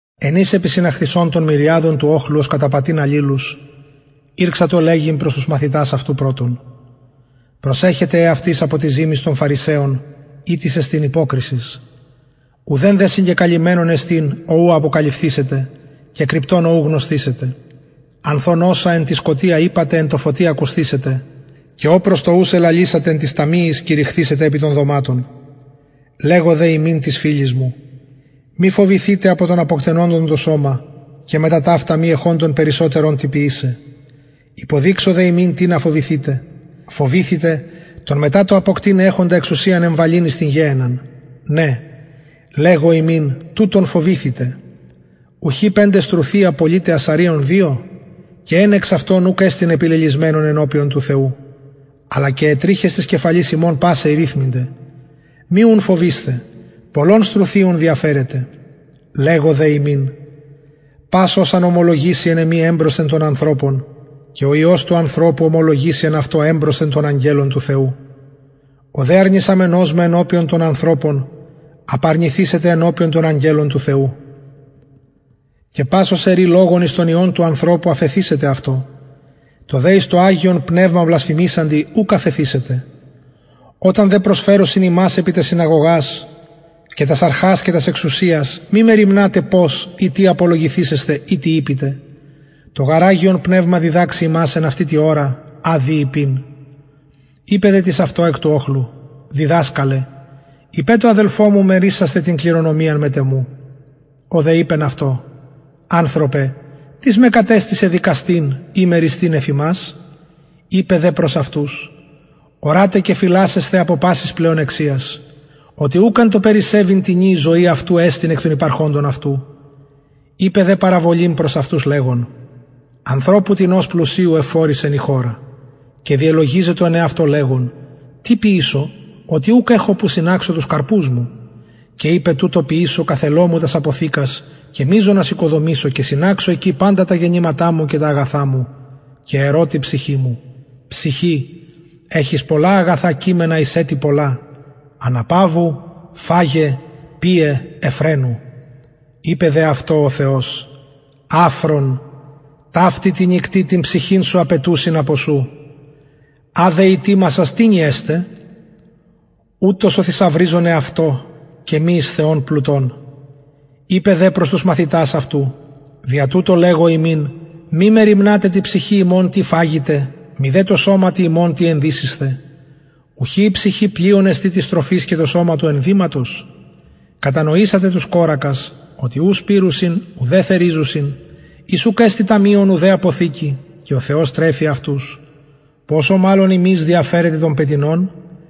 εν οις επισυναχθεισων των μυριαδων του οχλου ωστε καταπατειν αλληλους ηρξατο λεγειν προς τους μαθητας αυτου πρωτον προσεχετε εαυτοις απο της ζυμης των φαρισαιων ητις εστιν υποκρισις ουδεν δε συγκεκαλυμμενον εστιν ο ουκ αποκαλυφθησεται και κρυπτον ο ου γνωσθησεται ανθ ων οσα εν τη σκοτια ειπατε εν τω φωτι ακουσθησεται και ο προς το ους ελαλησατε εν τοις ταμειοις κηρυχθησεται επι των δωματων λεγω δε υμιν τοις φιλοις μου μη φοβηθητε απο των αποκτενοντων το σωμα και μετα ταυτα μη εχοντων περισσοτερον τι ποιησαι υποδειξω δε υμιν τινα φοβηθητε φοβηθητε τον μετα το αποκτειναι εξουσιαν εχοντα εμβαλειν εις την γεενναν ναι λεγω υμιν τουτον φοβηθητε ουχι πεντε στρουθια πωλειται ασσαριων δυο και εν εξ αυτων ουκ εστιν επιλελησμενον ενωπιον του θεου αλλα και αι τριχες της κεφαλης υμων πασαι ηριθμηνται μη ουν φοβεισθε πολλων στρουθιων διαφερετε λεγω δε υμιν πας ος αν ομολογηση εν εμοι εμπροσθεν των ανθρωπων και ο υιος του ανθρωπου ομολογησει εν αυτω εμπροσθεν των αγγελων του θεου ο δε αρνησαμενος με ενωπιον των ανθρωπων απαρνηθησεται ενωπιον των αγγελων του θεου και πας ος ερει λογον εις τον υιον του ανθρωπου αφεθησεται αυτω τω δε εις το αγιον πνευμα βλασφημησαντι ουκ αφεθησεται οταν δε προσφερωσιν υμας επι τας συναγωγας και τας αρχας και τας εξουσιας μη μεριμνατε πως η τι απολογησησθε η τι ειπητε το γαρ αγιον πνευμα διδαξει υμας εν αυτη τη ωρα α δει ειπειν ειπεν δε τις αυτω εκ του οχλου διδασκαλε ειπε τω αδελφω μου μερισασθαι μετ εμου την κληρονομιαν ο δε ειπεν αυτω ανθρωπε τις με κατεστησεν δικαστην η μεριστην εφ υμας ειπεν δε προς αυτους ορατε και φυλασσεσθε απο της πλεονεξιας οτι ουκ εν τω περισσευειν τινι η ζωη αυτω εστιν εκ των υπαρχοντων αυτου ειπεν δε παραβολην προς αυτους λεγων ανθρωπου τινος πλουσιου ευφορησεν η χωρα και διελογιζετο εν εαυτω λεγων τι ποιησω οτι ουκ εχω που συναξω τους καρπους μου και ειπεν τουτο ποιησω καθελω μου τας αποθηκας και μειζονας οικοδομησω και συναξω εκει παντα τα γενηματα μου και τα αγαθα μου και ερω τη ψυχη μου ψυχη εχεις πολλα αγαθα κειμενα εις ετη πολλα αναπαυου φαγε πιε ευφραινου ειπεν δε αυτω ο θεος αφρον ταυτη τη νυκτι την ψυχην σου απαιτουσιν απο σου α δε ητοιμασας τινι εσται ουτως ο θησαυριζων εαυτω και μη εις θεον πλουτων ειπεν δε προς τους μαθητας αυτου δια τουτο υμιν λεγω μη μεριμνατε τη ψυχη υμων τι φαγητε μηδε τω σωματι τι ενδυσησθε η ψυχη πλειον εστιν της τροφης και το σωμα του ενδυματος κατανοησατε τους κορακας οτι ου σπειρουσιν ουδε θεριζουσιν οις ουκ εστιν ταμειον ουδε αποθηκη και ο θεος τρεφει αυτους ποσω μαλλον υμεις διαφερετε των πετεινων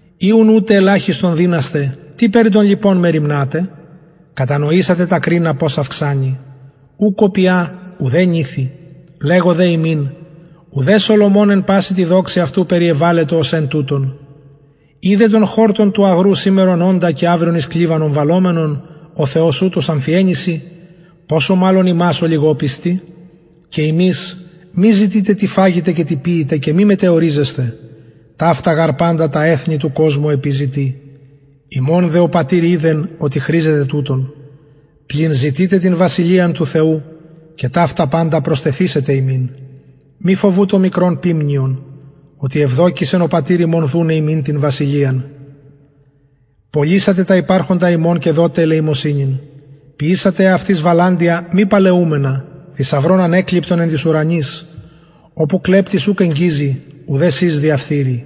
ει ουν ουτε ελαχιστον δυνασθε τι περι των λοιπων μεριμνατε κατανοησατε τα κρινα πως αυξανει ου κοπια ουδε νηθει λεγω δε υμιν ουδε σολομων εν παση τη δοξη αυτου περιεβαλετο ως εν τουτων ει δε τον χορτον εν τω αγρω σημερον οντα και αυριον εις κλιβανον βαλλομενον ο θεος ουτως αμφιεννυσιν ποσω μαλλον υμας ολιγοπιστοι και υμεις μη ζητειτε τι φαγητε η τι πιητε και μη μετεωριζεσθε ταυτα γαρ παντα τα εθνη του κοσμου επιζητει υμων δε ο πατηρ οιδεν οτι χρηζετε τουτων πλην ζητειτε την βασιλειαν του θεου και ταυτα παντα προστεθησεται υμιν μη φοβου το μικρον ποιμνιον οτι ευδοκησεν ο πατηρ υμων δουναι υμιν την βασιλειαν πωλησατε τα υπαρχοντα υμων και δοτε ελεημοσυνην ποιησατε εαυτοις βαλαντια μη παλαιουμενα θησαυρον ανεκλειπτον εν τοις ουρανοις οπου κλεπτης ουκ εγγιζει ουδε σης διαφθειρει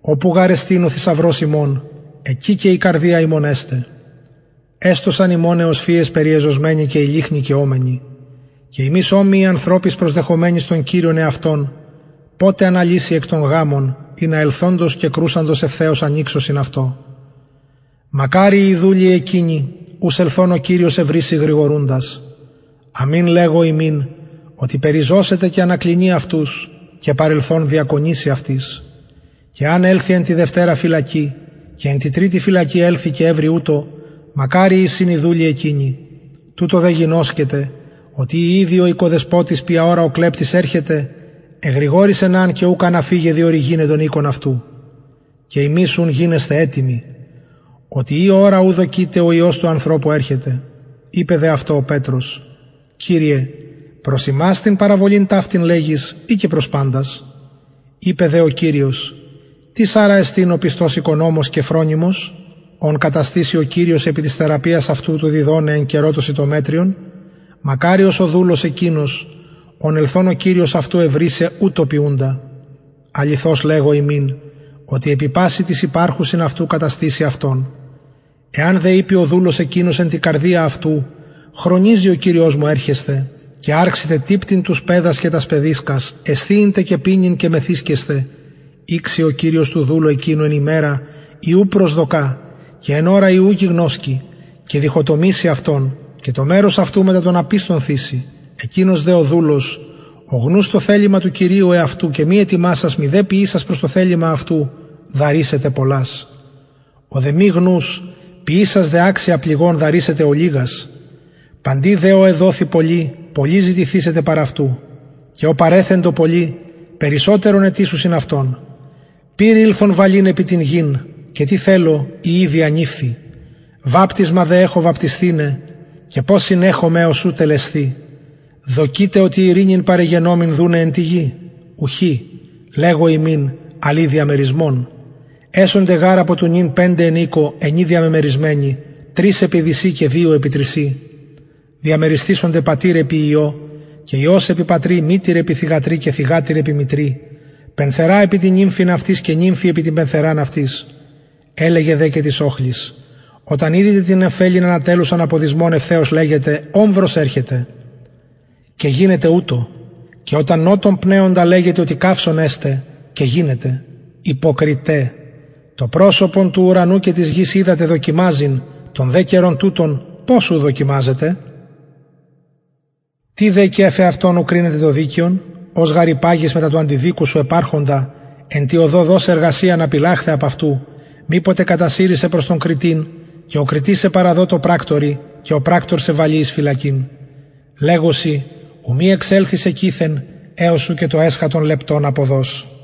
οπου γαρ εστιν ο θησαυρος υμων εκει και η καρδια υμων εσται εστωσαν υμων αι οσφυες περιεζωσμεναι και οι λυχνοι καιομενοι και υμεις ομοιοι ανθρωποις προσδεχομενοις τον κυριον εαυτων ποτε αναλυση εκ των γαμων ινα ελθοντος και κρουσαντος ευθεως ανοιξωσιν αυτω μακαριοι οι δουλοι εκεινοι ους ελθων ο κυριος ευρησει γρηγορουντας αμην λεγω υμιν οτι περιζωσεται και ανακλινει αυτους και παρελθων διακονησει αυτοις και εαν ελθη εν τη δευτερα φυλακη και εν τη τριτη φυλακη ελθη και ευρη ουτως μακαριοι εισιν οι δουλοι εκεινοι τουτο δε γινωσκετε οτι ει ηδει ο οικοδεσποτης ποια ωρα ο κλεπτης ερχεται εγρηγορησεν αν και ουκ αν αφηκεν διορυγηναι τον οικον αυτου και υμεις ουν γινεσθε ετοιμοι οτι η ωρα ου δοκειτε ο υιος του ανθρωπου ερχεται ειπεν δε αυτω ο πετρος κυριε προς ημας την παραβολην ταυτην λεγεις η και προς παντας ειπεν δε ο κυριος τις αρα εστιν ο πιστος οικονομος και φρονιμος ον καταστησει ο κυριος επι της θεραπειας αυτου του διδοναι εν καιρω το σιτομετριον μακαριος ο δουλος εκεινος ον ελθων ο κυριος αυτου ευρησει ποιουντα ουτως αληθως λεγω υμιν οτι επι πασιν τοις υπαρχουσιν αυτου καταστησει αυτον εαν δε ειπη ο δουλος εκεινος εν τη καρδια αυτου χρονιζει ο κυριος μου ερχεσθαι και αρξηται τυπτειν τους παιδας και τας παιδισκας εσθιειν τε και πινειν και μεθυσκεσθαι ηξει ο κυριος του δουλου εκεινου εν ημερα η ου προσδοκα και εν ωρα η ου γινωσκει και διχοτομησει αυτον και το μερος αυτου μετα των απιστων θησει εκεινος δε ο δουλος ο γνους το θελημα του κυριου εαυτου και μη ετοιμασας μηδε ποιησας προς το θελημα αυτου δαρησεται πολλας ο δε μη γνους ποιησας δε αξια πληγων δαρησεται ολιγας παντι δε ω εδοθη πολυ πολυ ζητηθησεται παρ αυτου και ω παρεθεντο πολυ περισσοτερον αιτησουσιν αυτον πυρ ηλθον βαλειν εις την γην και τι θελω ει ηδη ανηφθη βαπτισμα δε εχω βαπτισθηναι και πως συνεχομαι εως ου τελεσθη δοκειτε οτι ειρηνην παρεγενομην δουναι εν τη γη ουχι λεγω υμιν αλλ η διαμερισμον εσονται γαρ απο του νυν πεντε εν οικω ενι διαμεμερισμενοι τρεις επι δυσιν και δυο επι τρισιν διαμερισθησεται πατηρ επι υιω και υιος επι πατρι μητηρ επι θυγατρι και θυγατηρ επι μητρι πενθερα επι την νυμφην αυτης και νυμφη επι την πενθεραν αυτης ελεγεν δε και τοις οχλοις οταν ιδητε την νεφελην ανατελλουσαν απο δυσμων ευθεως λεγετε ομβρος ερχεται και γινεται ουτως και οταν νοτον πνεοντα λεγετε οτι καυσων εσται και γινεται υποκριται το προσωπον της γης και του ουρανου οιδατε δοκιμαζειν τον δε καιρον τουτον πως ου δοκιμαζετε τι δε και αφ εαυτων ου κρινετε το δικαιον ως γαρ υπαγεις μετα του αντιδικου σου επ αρχοντα εν τη οδω δος εργασιαν απηλλαχθαι απ αυτου μηποτε κατασυρη σε προς τον κριτην και ο κριτης σε παραδω τω πρακτορι και ο πρακτωρ σε βαλη εις φυλακην λεγω σοι ου μη εξελθης εκειθεν εως ου και τον εσχατον λεπτον αποδως